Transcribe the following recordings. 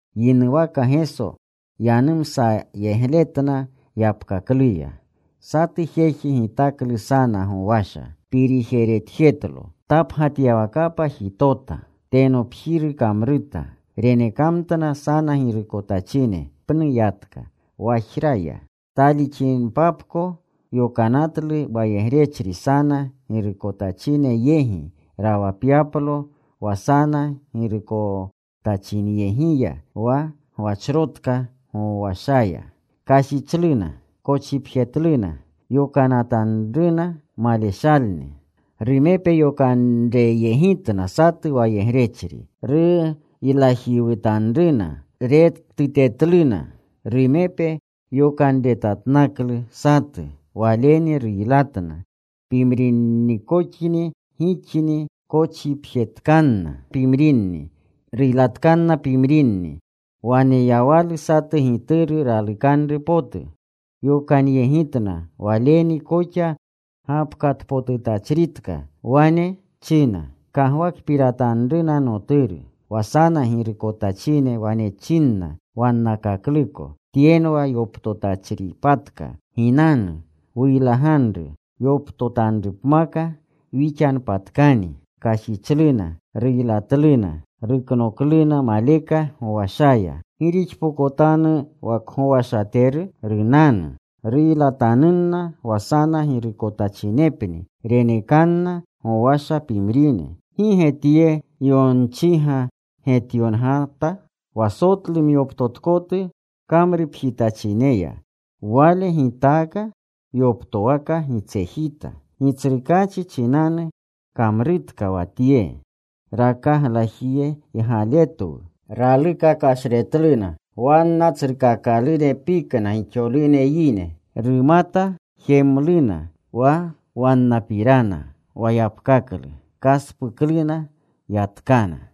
Yinuwaka Geso yanumsayegletna yapkakluya: “Satu jeji gitaklu sana gowasha. Pirijeretjetlo. Tapgatyawakapa jitota. Tenopjiru kamruta. Renekamtna sana girukotachine. Pnu yatka. Wajra ya. Talixinipapko yokanatlu wayegrechri sana girukotachine yegi rawapyaplo wa sana girukotachinyegiya wa gwachrotka gowashaya. Kashichluna. Kochipjetluna. Yokanatanruna maleshalni. Rumepe yokanreyegitna satu wayegrechri. Ruylajiwutanruna. Rektutetluna. Rumepe yokanretatnaklu satu. Waleni ruylatna. Pimrinnikoxni gixni. Kochipjetkanna pimrinni. Ruylatkanna pimrinni. “Waneyawalu satu gituru ralukanru potu. Yokanyegitna waleni koxa gapkatpotutachritka. Wane china, ‘Kagwakpiratanruna noturu.’ “Wa sana girukotachine wane chinna wannakakluko, ‘Tyenwa yoptotachripatka. Ginanu. Wuylaganru. Yoptotanrupmaka wixanpatkani.’ Kashichluna. Ruylatluna. Ruknokluna maleka gowashaya. “¿Gi rixpokotanu wa kgowashateru? Runanu. Ruylatanunna wa sana girukotachinepni. Renekanna gowasha pimrine. ¿Gi ge tye yonchiga getyongata? Wa sotlu myoptotkotu kamrupjitachineya, Wale gitaaka yoptowaka gitsejita. Gitsrukaachi chinanu kamrutka wa tye. Rakaglajiygaletwu.” Raluka kashretluna. Wanna tsrukakalune pikna gixolune yine. Rumata jemluna wa wannapirana wa yapkaklu. Kaspukluna. Yatkana.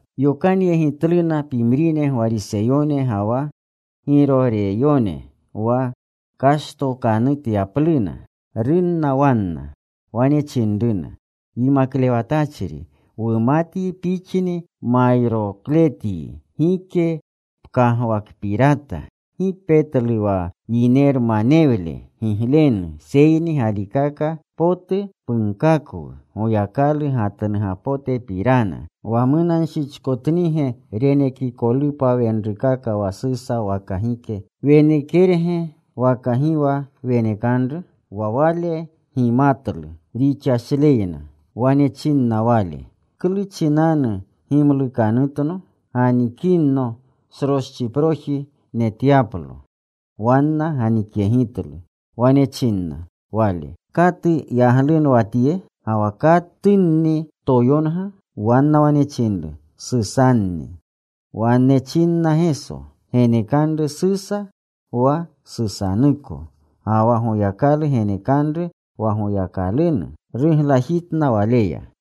Yokanyegitluna pimrine Gwariseyone ga wa Giroreyone wa kashtokanutyapluna. Runna wanna. Wane chinruna, “Yimaklewatachri, wumatyi Pixni mayrokletyi. Gike pkagwakpirata. Gi petlu wa yinermanewle giglenu, seyni galikaka potu punkakwu Goyakalu gatnugapotepirana ¿Wa munanshichkotnige renekikolupa wenrukaka wa Susa waka gike? ¿Wenekerge waka gi wa wenekanru?” Wa Wale gimatlu rixashleyna. Wane chinna Wale, “¿Klu chinanu gimlukanutno? Ganikinno sroschiproji netyaplo.” Wanna ganikyegitlu. Wane chinna Wale, “¿Katu yaglunwa tye, ga wa katunni toyonga?” Wanna wane chinru, “Susanni.” Wane chinna Geso, “Genekanru Susa wa Susanuko, ga wa Goyakalu genekanru wa Goyakalunu.” Ruglajitna Waleya.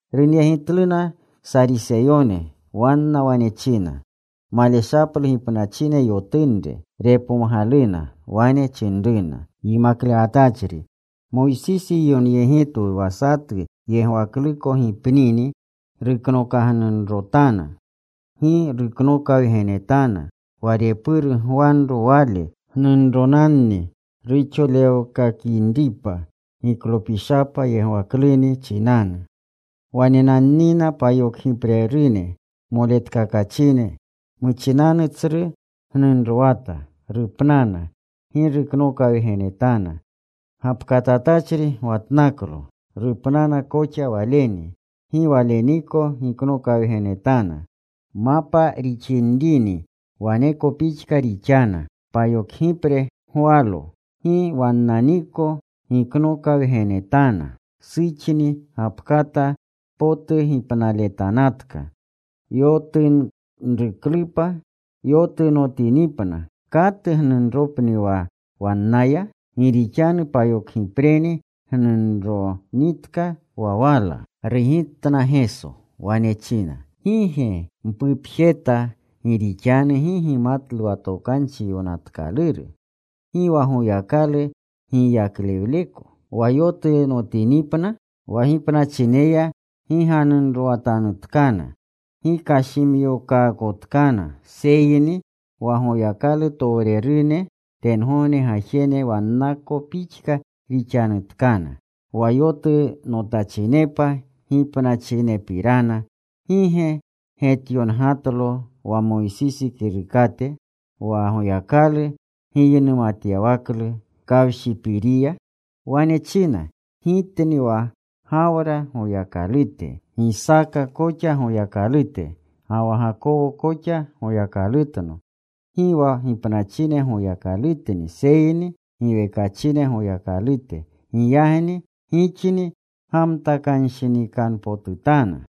Runyegitluna Sariseyone. Wanna wane china maleshaplu gipnachine yotunre. Repomgaluna. Wane chinruna, “Yimaklewatachri, Moysisi yonyegitwu wa satu yegwakluko gipnini, ruknokagnunrotana, gi ruknokawgenetana wa repuru gwanro wale gnunronanni, ruxolewkakinripa giklopishapa yegwakluni chinanu. Wanenannina payokgiprerune moletkakachine. Muchinanu tsru gnunrowata. Rupnana. Gi ruknokawgenetana. Gapkatatachri gwatnaklo. Rupnana koxa waleni. Gi waleniko giknokawgenetana. Mapa rixinrini waneko pixka rixana. Payokgipre gwalo. Gi wannaniko giknokawgenetana. Suxni gapkata potu gipnaletanatka. Yotunruklupa yotunotinipna, ¿katu gnunropni wa wannaya? Gi rixanu payokgipreni gnunronitka wa wala.” Rugitna Geso. Wane china, “¿Gi ge mpupjeta gi rixanu gi gimatlu wa Tokanchi Yonatkaluru, gi wa Goyakalu giyaklewleko? Wa yotunotinipna wa gipnachineya gi ganunrowatanutkana, gi kashimyokaakotkana, seyni wa Goyakalutowrerune tengogne gajene wannako pixka rixanutkana. Wa yotunotachinepa gipnachinepirana, ¿gi ge getyongatlo wa Moysisi kirukate, wa Goyakalu giynumatyawaklu kawshipiriya? Wane china: Gitni wa Gawra Goyakalute, Gisaaka koxa Goyakalute, ga wa Gakowo koxa Goyakalutno. Gi wa gipnachine Goyakalutni, seyni giwekachine Goyakalute. Giyagni gixni gamtakanshinikanpotutana.”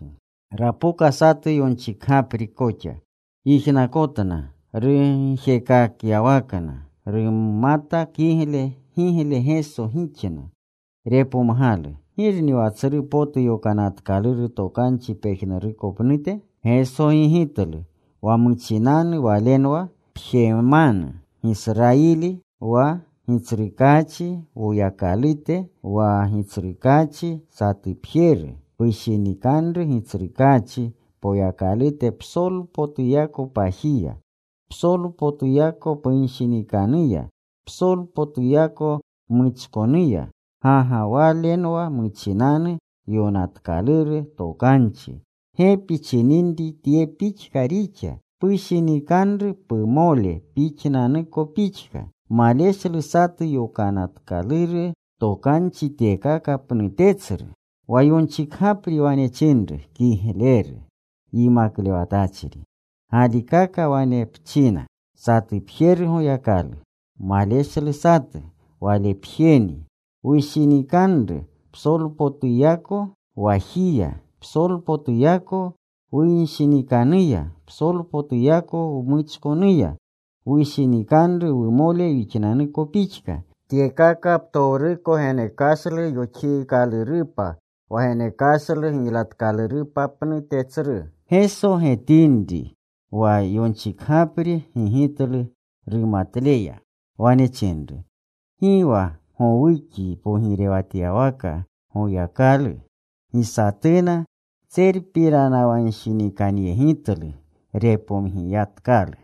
Rapoka satu yonchikgapri koxa. Yijnakotna rugjekakyawakna. Rumata kigle gigle Geso gixna. Repomgalu, “¿Girni wa tsru potu Yokanatkaluru Tokanchi pejnuruko pnute?” Geso gigitlu, “Wa muchinanu walenwa: Pjemanu, Gisrayili. Wa Gitsrukaachi Woyakalute, wa Gitsrukaachi satupjeru. Pushinikanru Gitsrukaachi Poyakalute psolpotuyako pajiya, psolpotuyako punshinikanuya, psolpotuyako pmuchkonuya. Ga ga walenwa muchinanu Yokanatkaluru Tokanchi. Gepi chininri tye pixka rixa: Pushinikanru pumole pixnanuko pixka. Maleshlu satu Yokanatkaluru Tokanchi tyekaka pnute tsru.” Wa yonchikgapri wane chinru, “Kigleru, Yimaklewatachri. Galikaka wane pchina, Satupjeru Goyakalu. Maleshlu satu. Walepjeni. Wushinikanru psolpotuyako wajiya, psolpotuyako wunshinikanuya, psolpotuyako wmuchkonuya. Wushinikanru wumole wixnanuko pixka, tyekaka ptowruko genekashlu yoxiikalurupa wa genekashlu giylatkalurupa pnute tsru.” Geso getinri wa yonchikgapri gigitlu rumatleya, wane chinru, “Gi wa gowukyi pogirewatyawaka Goyakalu.” Gi satuna tserpiranawanshinikanyegitlu repomgiyatkalu.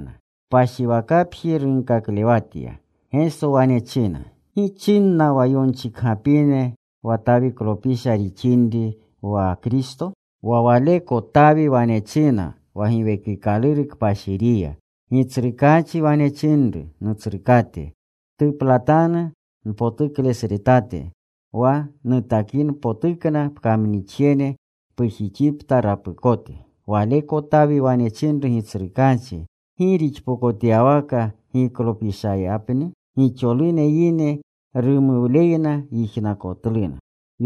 Kpashiwakapji runkaklewatya. Geso wane china, “¿Gi chinna wa yonchikgapine wa Tawiklopisha rixinri wa Kristo? Wa waleko Tawi wane china wa Giwekikaluru Kpashiriya: Gitsrukaachi wane chinru Nutsrukate, Ptuplatanu npotuklesretate, Wa nutakinpotukna pkamnixjene pujixipta rapukote. Waleko Tawi wane chinru Gitsrukaachi. ¿Gi rixpokotyawaka giklopishayapni?” Gixolune yine rumuwleyna yijnakotluna.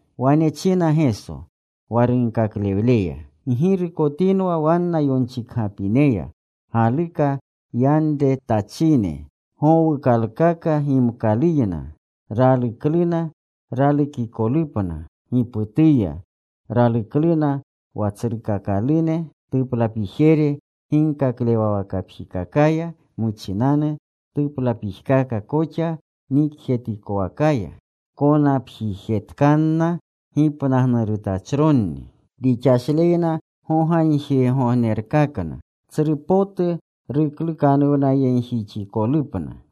Wane china Geso wa runkaklewleya, “Ggirukotinwa wanna yonchikgapineya, galuka yanretachine gowuukalkaka gimkaluyna. Ralukluna ralukikolupna giputuya. Ralukluna wa tsrukakalune tuplapijere ginkaklewawakapjikakaya, muchinanu tuplapijkaka koxa nikjetikowakaya. Konapjijetkanna gipnagnurutachronni. Rixashleyna gogagjirgognerkakna. Tsru potu ruklukanuwnayegjixikolupna.”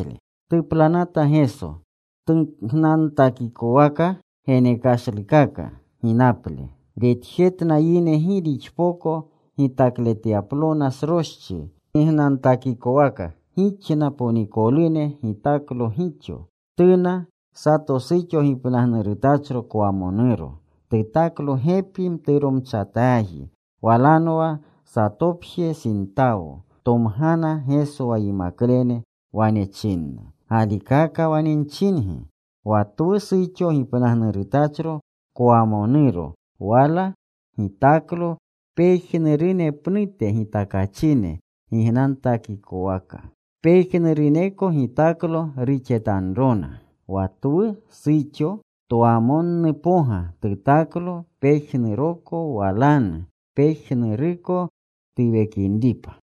Tuplanata Geso tugnantakikowaka genekashlukaka ginaple. Retjetna yine gi rixpoko gitakletyaplona sroschi gignantakikowaka. Gixna ponikolune gitaklo gixo. Tuna sato suxo gipnagnurutachro kwamonuro. Tutaklo gepi mturomchataaji. Walanwa satopje sintawo. Tomgana Geso wa yimaklene. Wane china, “Galikaka wane nchingi, wa twu suxo gipnagnurutachro kwamonuro wala gitaklo pejnurune pnute gitakachine gignantakikowaka. Pejnuruneko gitaklo ruxetanrona. Wa twu suxo twamonnupoga tutaklo pejnuroko walanu, pejnuruko tuwekinripa.”